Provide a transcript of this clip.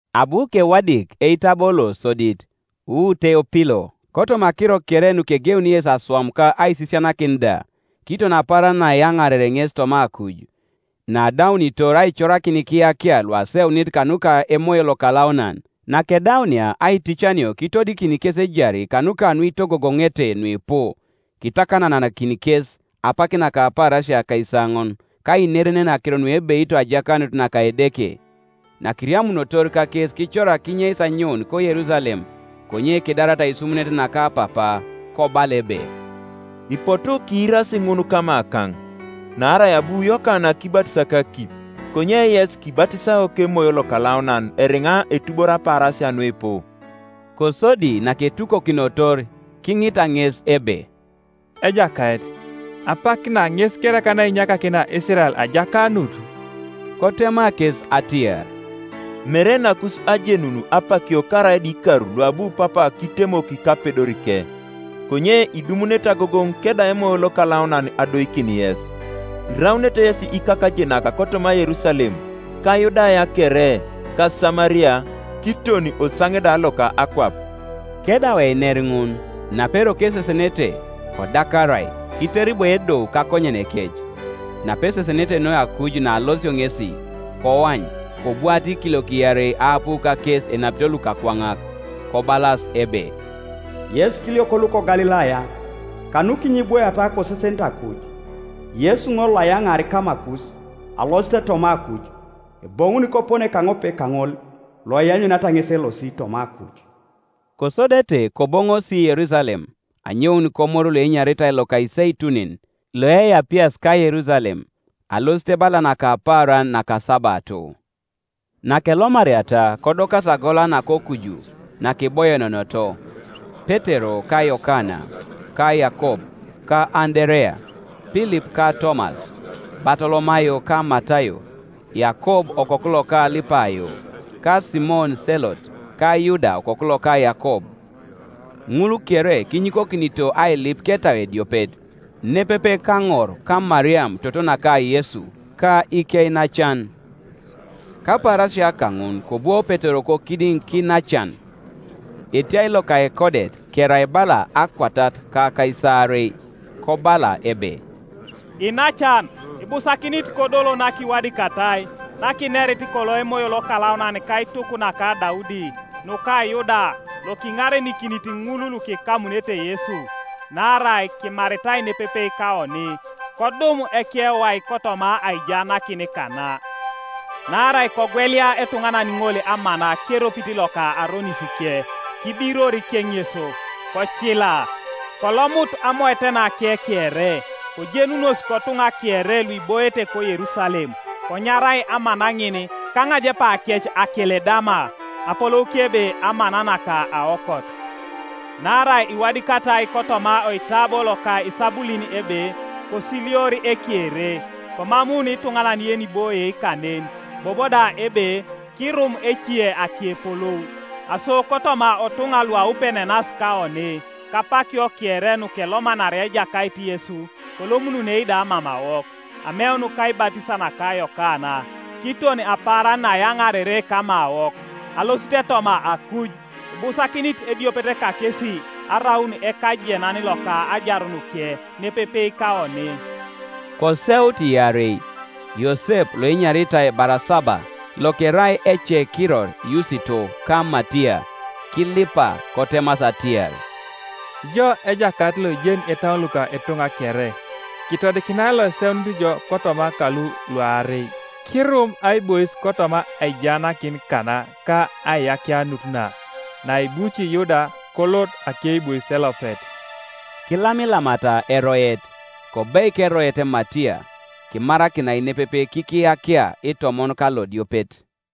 Abu kewadik eitabo losodit, wu Teopilo, kotoma akiro kere nukegeuni Yesu aswam ka aisisianakin da, kiton apaaran naayaŋarere ŋes toma akuj, naadaunitor aicorakin ikiyakia luaseunit kanuka Emoyo Lokalaunan, Nakedaunia aiticanio kitodikin kes ejari kanuka nuitogogoŋete nuipu, kitakananakin kes apak naka apaarasia akaisaoŋon, ka ainerenen akiro nuebeito ajakanut naka Edeke. Nakiriamunotor kakes kicorak kinyeis anyoun koYerusalem, konye kidarata aisumunet naka Papa. Kobala ebe, “Ipotu kiirasi ŋun kamakaŋ; naarai abu Yokana kibatis kakip, konye yes kibatisao kEmoyo Lokalaunan eriŋa etuboro apaarasia nuipu.” Kosodi naketukokinotor, kiŋita ŋes ebe, “Ejakait, apak na ŋes kereka nainyakakinia Isirael ajakanut?” Kotema kes atiar, “Mere nakus ajenun apakio karaida ikar luabu Papa kitemok kapedorike. Konye idumunete agogoŋ kedau Emoyo Lokalaunan adoikin yes; iraunete yesi ikakajenak kotoma Yerusalem, ka Yudaya kere, ka Samaria, kiton osaŋe da loka akwap.” Kedau einer ŋun, naperoko esesenete, kodakarai, kiteribo edou kakonyenekec. Napesesenete noi akuj naalosio ŋesi, koany kobwaata ikiliok iarei aapu kakes enapito lukakwaŋak, kobalas ebe, “Yes ikiliok luko Galilaya, kanukinyo ibwoiata kosesenete akuj? Yesu ŋol, loayaŋaar kamakus alosit toma akuj, eboŋuni kopone kaŋope kaŋol loianyuniata ŋes elosi toma akuj.” Kosodete koboŋosi Yerusalem anyoun komoru loenyaritai loka Iseitunin, loeapias ka Yerusalem, alosit bala naka apaaran nakasabato. Nakelomariata kodokasi agola nakokuju, nakiboienenoto; Petero ka Yokana, ka Yakob, ka Anderea, Pilip ka Tomas, Batolomayo ka Matayo, Yakob okoku loka Alipayo, ka Simon Selot, ka Yuda okoku loka Yakob. Ŋul kere kinyikokinito ailip ketau ediopet, nepepe kaŋor ka Mariam toto naka Yesu, ka ikeinacan. Kapaarasia kaŋun kobwo Petero kokidiŋ kiinacan, (etiai loka ekodet kerai bala akwatat ka akaisaarei) kobala ebe, “Iinacan, ibusakinit kodolo nakiwadikatai, nakinerit kolo Emoyo Lokalaunan kaituk naka Daudi, nuka Yuda lokiŋarenikinit ŋul lukikamunete Yesu. Naarai kimaritai nepepe kaoni, kodum ekewai kotoma aijaanakin kana. (Naarai kogwelia etuŋanan ŋol amana keropit loka aronisike; kibiror keŋeso kocila, kolomut amoetenake kere. Kojenunos kotuŋa kere luiboiete koYerusalem, konyarai amana ŋin kaŋajepakec Akeledama, apolouke ebe Amana naka Aokot.) Naarai iwadikatai kotoma oitabo loka Isabulin ebe, ‘Kosilior ekere, Komamuun ituŋanan yeniboie kanen.’ Bobo da ebe, ‘Kirum ece akepolou,’ Aso kotoma otuŋa luaupenenas kaoni kapakio kere nukelomanaria Ejakait Yesu kolomununei da mamawok, ameun kaibatis naka Yokana, kiton apaaran naayaŋarere kamawok alosit toma akuj, ibusakinit ediopet kakesi araun ekajenan loka ajarunike nepepe kaoni.” Koseut iarei, Yosep loenyaritai Barasaba, lokerai ekekiror Yusito, ka Matiya. Kilipa, kotemasi atiar, “Ijo Ejakait loijeni itauon luka ituŋa kere, kitodikinai loiseunit ijo kotoma kalu luarei, kirum aibois kotoma aijaanakin kana ka aiyakianut na, naebuci Yuda kolot akeibois elopet.” Kilamilamata eroet, kobeik eroet Matiya; kimarakinai nepepe kikiyakia itomon kalodiopet.